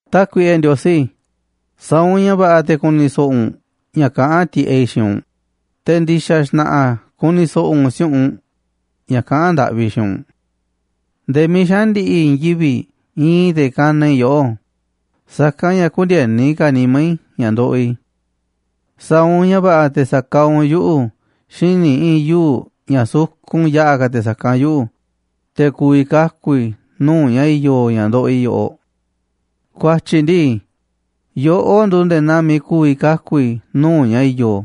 Tákuiꞌe Ndiosí, sa̱a̱ u̱nꞌ ña̱ va̱ꞌa̱ te̱ ku̱ni̱ so̱ꞌo̱ u̱nꞌ ña̱ kaꞌán tiꞌeꞌ i̱ xiinꞌ u̱nꞌ, te̱ ndi̱xa̱ xna̱ꞌa̱ ku̱ni̱ so̱ꞌo̱ u̱nꞌ si̱u̱ꞌunꞌ ña̱ kaꞌán ndaꞌvi i̱ xiinꞌ u̱nꞌ. Nde̱e̱ miiꞌ xaꞌa̱n ndi̱ꞌi̱ i̱i̱n yivi̱ꞌ iinꞌ i̱ te̱ kanaꞌ i̱ yoꞌó, sa̱kanꞌ ña̱ kündieni ka̱ nimá i̱ ña̱ ndoꞌoꞌ i̱. Sa̱a̱ u̱nꞌ ña̱ va̱ꞌa̱ te̱ sa̱kaaꞌ u̱nꞌ yuꞌu̱ xíniꞌ i̱i̱n yuu̱ꞌ ña̱ sukun yaꞌa̱ ka̱ te̱ sa̱kanꞌ yuꞌu̱, te̱ ku̱vi̱ kaku̱ i̱ nuu̱ꞌ ña̱ i̱yo̱ ña̱ ndoꞌoꞌ i̱ yoꞌoꞌ. Ku̱a̱tyi̱ ndii, yoꞌó nduuꞌ nde̱e̱ naa miiꞌ ku̱vi̱ kaku̱ i̱ nuu̱ꞌ ña̱ i̱yo̱,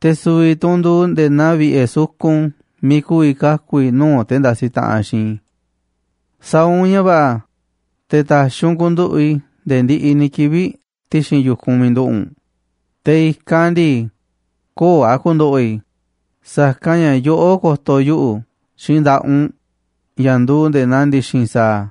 te̱ su̱vi̱ tu̱ u̱nꞌ nduuꞌ nde̱e̱ naa vi̱ꞌe̱ sukun miiꞌ ku̱vi̱ kaku̱ i̱ nuu̱ꞌ te̱ ndasiꞌ taꞌanꞌ xiinꞌ i̱. Sa̱a̱ u̱nꞌ ña̱ va̱ꞌa̱ te̱ ta̱xi̱ u̱nꞌ ku̱nduꞌu̱ꞌ i̱ nde̱e̱ ndiꞌiꞌ ni̱ kivi̱ꞌ ti̱xi̱n yu̱kunꞌ miiꞌ nduꞌu̱ꞌ u̱nꞌ, te̱ i̱kanꞌ ndii, köo̱ꞌ a̱ ku̱ndo̱ꞌo̱ i̱, sa̱kanꞌ ña̱ yoꞌó ko̱to̱ yuꞌu̱ xiinꞌ nda̱ꞌaꞌ u̱nꞌ ña̱ nduuꞌ nde̱e̱ naa ndi̱xi̱n sa̱a̱.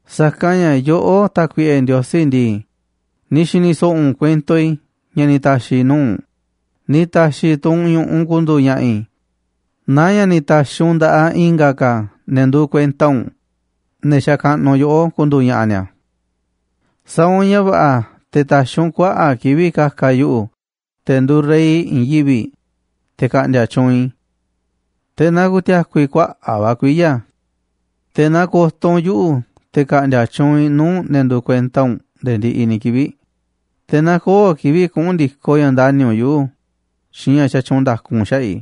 Sa̱kanꞌ ña̱ yoꞌó, Tákuiꞌe Ndiosí ndii, ni̱ xi̱ni̱ so̱ꞌo̱ u̱nꞌ kuento i̱ ña̱ ni̱ ta̱xi̱ i̱ nuu̱ꞌ u̱nꞌ, ni̱ ta̱xi̱ tu̱ u̱nꞌ ñu̱ꞌuꞌ ku̱ndu̱u̱ ña̱ꞌa̱ i̱ naa ña̱ ni̱ ta̱xi̱ u̱nꞌ nda̱ꞌaꞌ i̱nga̱ ka̱ ne̱ nduuꞌ kuenta u̱nꞌ, ne̱ xakaꞌnuꞌ yoꞌó, ku̱ndu̱u̱ ña̱ꞌa̱ ni̱a̱. Sa̱a̱ u̱nꞌ ña̱ va̱ꞌa̱ te̱ ta̱xi̱ u̱nꞌ kuaꞌa̱ꞌ kivi̱ꞌ ka̱ka̱ yuꞌu̱, te̱ nduuꞌ rey i̱i̱n yivi̱ꞌ, te̱ ka̱ꞌndi̱a̱ tyuunꞌ i̱, te̱ na ku̱ti̱a̱ku̱ i̱ kuaꞌa̱ꞌ va̱ kuiya̱. Te̱ na ko̱to̱ u̱nꞌ yuꞌu̱ te̱ ka̱ꞌndi̱a̱ tyuunꞌ i̱ nuu̱ꞌ ne̱ nduuꞌ kuenta u̱nꞌ nde̱e̱ ndiꞌiꞌ ni̱ kivi̱ꞌ, te̱ na köo̱ꞌ kivi̱ꞌ kuꞌu̱n ndi̱koꞌ ña̱ ndani̱ u̱nꞌ yuꞌu̱ xiinꞌ ña̱ xatyuunꞌ nda̱ku u̱nꞌ xaꞌa̱ꞌ i̱.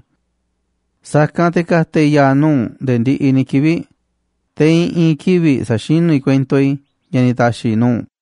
Sa̱kanꞌ te̱ ka̱ta̱ i̱ ya̱a̱ nuu̱ꞌ u̱nꞌ nde̱e̱ ndiꞌiꞌ ni̱ kivi̱ꞌ, te̱ i̱ꞌi̱n kivi̱ꞌ sa̱xinú i̱ kuento i̱ ña̱ ni̱ ta̱xi̱ i̱ nuu̱ꞌ u̱nꞌ.